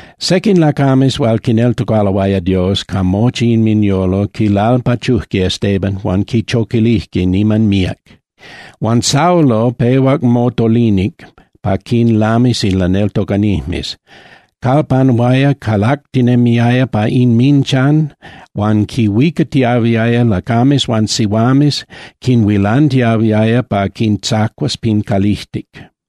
Sequin lacames hual quineltocaloaya Dios ca mochi inminyolo quilalpachujque Estebán huan quichoquilijque niman míac. Huan Saulo pehuac motolinic pa quinlamis in laneltocanijmes, calpanuaya calactinemiaya pa inminchan, huan quinhuicatiahuiaya lacames huan sihuames, quinhuilantiahuiaya pa quintzacuas pin calijtic.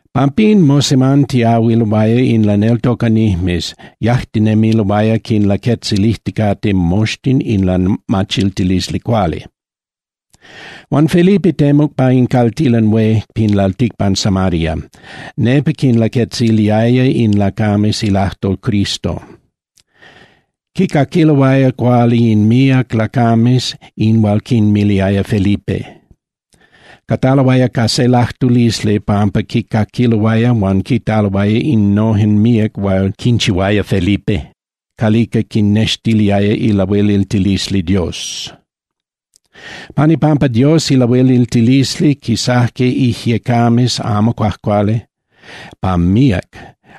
Pampín mosemantiahuiloaya in laneltocanijmes, yajtinemiloaya quinlaquetzilijticate moxtin in lamachiltilisli cuali. Huan Felipe temuc pa in caltilan hué pin lalticpan Samaria, nepa quinlaquetziliaya in lacames ilajtol Cristo. Quicaquiloaya cuali in míac lacames in hual quinmiliaya Felipe. Cataloaya ca se lajtulisli pampa quicaquiloaya huan quitaloaya innojen míac hual quinchihuaya Felipe calica quinnextiliaya ilahueliltilisli Dios. Pan ipampa Dios ilahueliltilisli quisajque ijyecames amo cuajcuali pa míac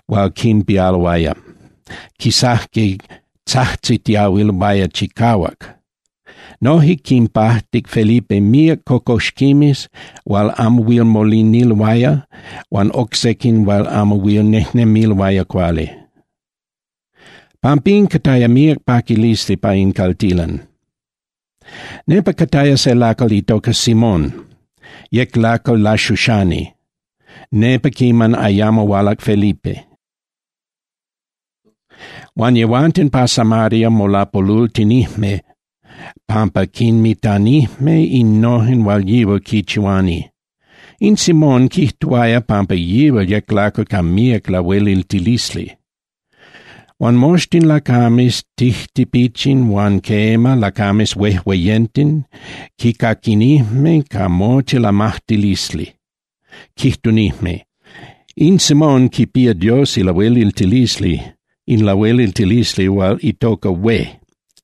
hual quinpialoaya, quisajque tzajtzitiahuiloaya chicahuac. Noje quinpajtic Felipe míac cocoxquimes hual amo huil moliniloaya huan oc sequin hual amo huil nejnemiloaya cuali. Pampín cataya míac paquilisli pa in caltilan. Nepa cataya se lacal itoca Simón, yec lacal laxuxani nepa quiman ayamo hualac Felipe. Huan yehuanten pa Samaria molapolultinijme pampa quinmitanijme innojen hual yihual quinchihuani. In Simón quijtuaya pampa yihual yec lacal ca míac lahueliltilisli. Huan moxtin lacames tijtipichin huan quema, lacames huejueyenten quicaquinijme ca mochi lamajtilisli, quijtunijme: —In Simón quipía Dios ilahueliltilisli, in lahueliltilisli hual itoca hué.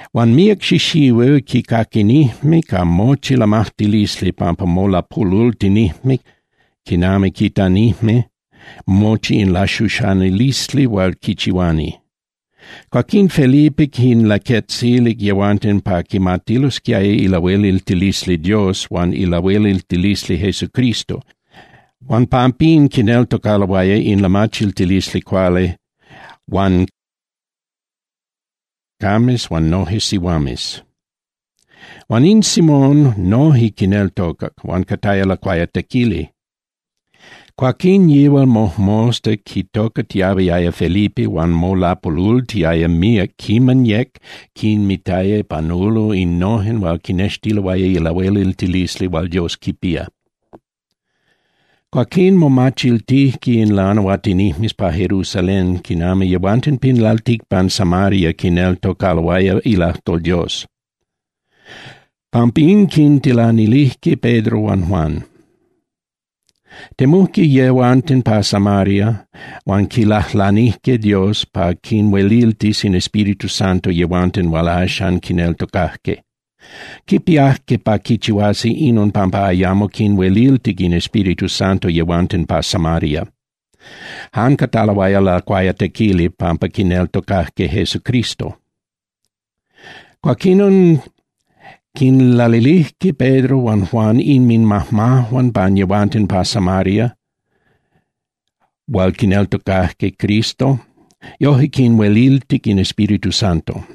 Huan míac xixihuil quicaquinijme ca mochi lamajtilisli pampa molapolultinijme quiman quitanijme mochi in laxuxanilisli hual quichihuani. Cuaquín Felipe quinlaquetzilic yehuanten pa quimatilosquiaya ilahueliltilisli Dios huan ilahueliltilisli Jesucristo, huan pampín quineltocaloaya in lamachiltilisli cuali huan cataloaya lacuayatequili lacames huan noje sihuames. Huan in Simón noje quineltocac huan cataya lacuayatequili. Cuaquín yihual mojmosta quitocatiahuiaya Felipe huan molapolultiaya míac quiman yec quinmitaya panulo innojen hual quinextiloaya ilahueliltilisli hual Dios quipía. Cuaquín momachiltijque in lanahuatinijmes pa Jerusalén quinami yehuanten pin lalticpan Samaria quineltocaloaya ilajtol Dios. Pampín quintilanilijque Pedro huan Juan. Temujque yehuanten pa Samaria huan quilajlanijque Dios pa quinhueliltis in Espíritu Santo yehuanten hual axan quineltocajque. Quipiajque pa quichihuasi inon pampa ayamo quinhueliltic in Espíritu Santo yehuanten pa Samaria. Jan cataloaya lacuayatequili pampa quineltocajque Jesucristo. Cuaquinon quinlalilijque Pedro huan Juan inminmajmajuan pan yehuanten pa Samaria hual quineltocajque Cristo, yojque quinhueliltic in Espíritu Santo.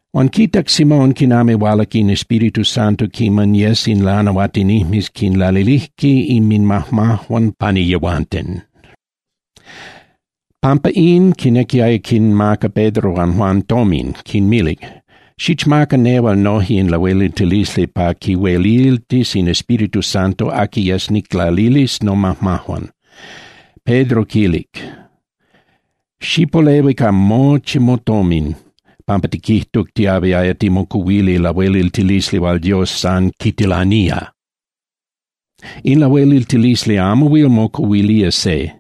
Huan quitac Simón quinami hualac in Espíritu Santo quiman yes in lanahuatinijmes quinlalilijque inminmajmajuan pani yehuanten. Pampa in quinequiaya quinmaca Pedro huan Juan tomin, quinmilic: —Xichmaca nehual noje in lahueliltilisli pa quihueliltis in Espíritu Santo aqui yes niclalilis nomajmajuan. Pedro quilic: —Xipolehui ca mochi motomin pampa tiquijtuc tiahuiaya timocuhuili lahueliltilisli hual Dios san quitilanía. In lahueliltilisli amo huil mocuhuilía se.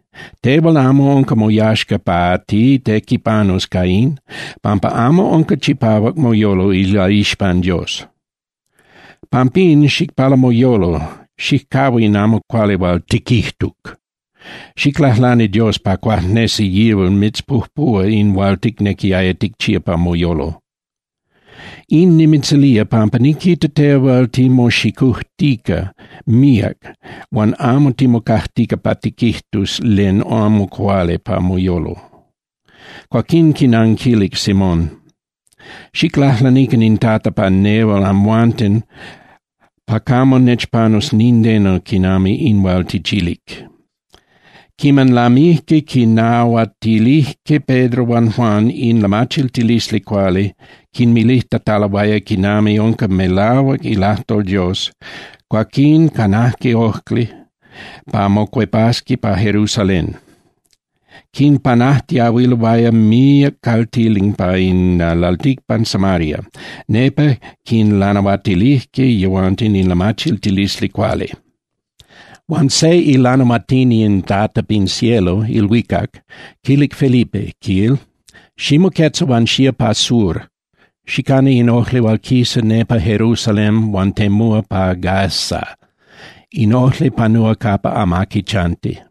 Tehual amo unca moyaxca pa titequipanus ca in, pampa amo unca chipahuac moyolo ilaixpan Dios. Pampín xicpala moyolo, xijcahua in amo cuali hual tiquijtuc. Xiclajlani Dios pa cuajnesi yihual mitzpujpuhua in hual ticnequiaya ticchía pa moyolo. In nimitzilía pampa niquita tehual timoxicujtica míac huan amo timocajtica pa tiquijtus len amo cuali pa moyolo. Cuaquín quinanquilic Simón: —Xiclajlanican in Tata pa nehual amhuanten pa camo nechpanus nindeno quinami in hual tichilic. Quiman lamijque quinnahuatilijque Pedro huan Juan in lamachiltilisli cuali quinmilijtataloaya quinami unca melahuac ilajtol Dios, cuaquín canajque ojli pa mocuepasqui pa Jerusalén. Quinpanajtiahuiloaya míac caltilan pa in lalticpan Samaria, nepa quinlanahuatilijque yehuanten in lamachiltilisli cuali. Huan se ilanahuatini in Tata pin cielo (ilhuicac) quilic Felipe, quil: —Ximoquetza huan xía pa sur, xicana in ojli hual quisa nepa Jerusalén huan temúa pa Gaza, in ojli panúa capa amaqui chanti.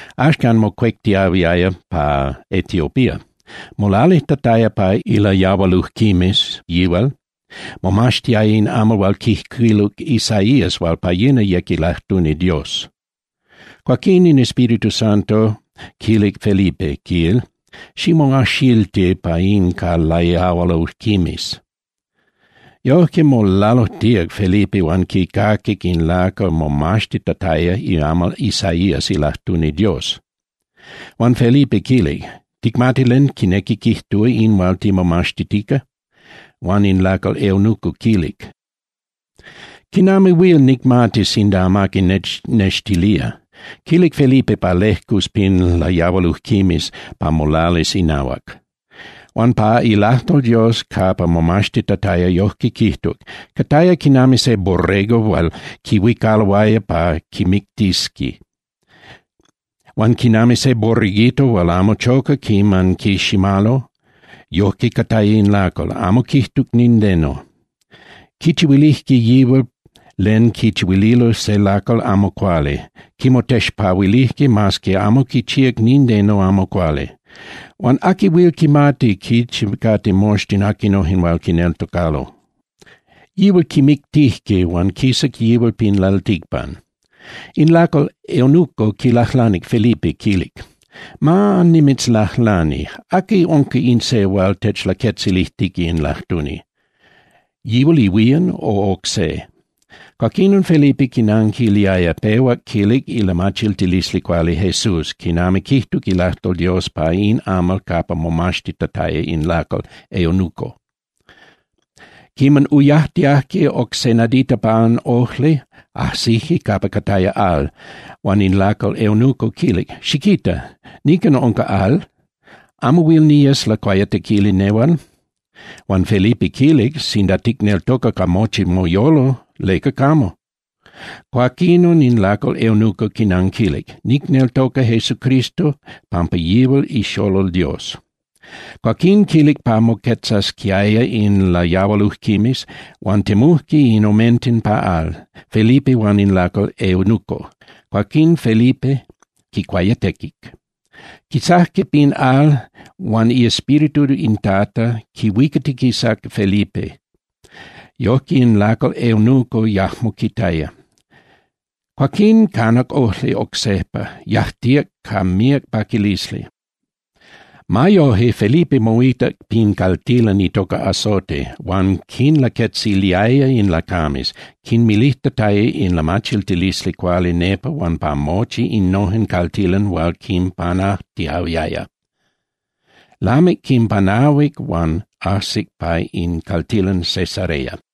Axcan mocuectiahuiaya pa Etiopía. Molalijtataya pa ilayahualujquimes yihual, momaxtiaya in amal hual quijcuiluc Isaías hual pa yina yec ilajtuni Dios. Cuaquín in Espíritu Santo quilic Felipe, quil: —Ximoajxilti pa in ca layahualujquimes. Yojque molalujtíac Felipe huan quicaquic in lacal momaxtitataya iamal Isaías ilajtuni Dios. Huan Felipe quilic: —¿Ticmati len quinequi quijtúa in hual timomaxtitica? Huan in lacal eunuco quilic: —¿Quinami huil nicmati sinda amaqui nechnextilía? Quilic Felipe pa lejcus pin layahualujquimes pa molalis inahuac. Huan pa ilajtol Dios capa momaxtitataya yojque quijtuc: Cataya quinami se borrego hual quihuicaloaya pa quimictisqui, huan quinami se borreguito hual amo choca quiman quiximalo, yojque cataya in lacal, amo quijtuc nindeno. Quichihuilijque yihual len quichihuililo se lacal amo cuali, quimotexpahuilijque mas que amo quichihuac nindeno amo cuali. Huan ¿aqui huil quimati quichi cate moxtin aquinojen hual quineltocalo? Yihual quimictijque huan quisac yihual pin lalticpan. In lacal eunuco quilajlanic Felipe, quilic: —Ma nimitzlajlani, ¿aqui unca in se hual techlaquetzilijtica in lajtuni? ¿Yihual ihuían, o oc se? Cuaquinon Felipe quinanquiliaya, pehuac quilic ilamachiltilisli cuali Jesús quinami quijtuc ilajtol Dios pa in amal capa momaxtitataya in lacal eunuco. Quiman uyajtiajque oc se nadita pan ojli, ajsijque capa cataya al, huan in lacal eunuco quilic: —Xiquita. Nican unca al. ¿Amo huil niyes lacuayatequili nehual? Huan Felipe quilic: —Sinda ticneltoca ca mochi moyolo, ¿leca camo? Cuaquinon in lacal eunuco quinanquilic: —Nicneltoca Jesucristo pampa yihual ixolol Dios. Cuaquín quilic pa moquetzasquiaya in layahualujquimes huan temujque in omenten pa al, Felipe huan in lacal eunuco, cuaquín Felipe quicuayatequic. Quisajque pin al, huan iEspíritu in Tata quihuicatiquisac Felipe, yojque in lacal eunuco yajmo quitaya. Cuaquín canac ojli oc sejpa, yajtíac ca míac paquilisli. Ma yoje, Felipe moitac pin caltilan itoca Azote huan quinlaquetziliaya in lacames, quinmilijtataya in lamachiltilisli cuali nepa huan pa mochi innojen caltilan hual quinpanajtiahuiaya. Lamic quinpanahuic huan ajsic pa in caltilan Cesarea.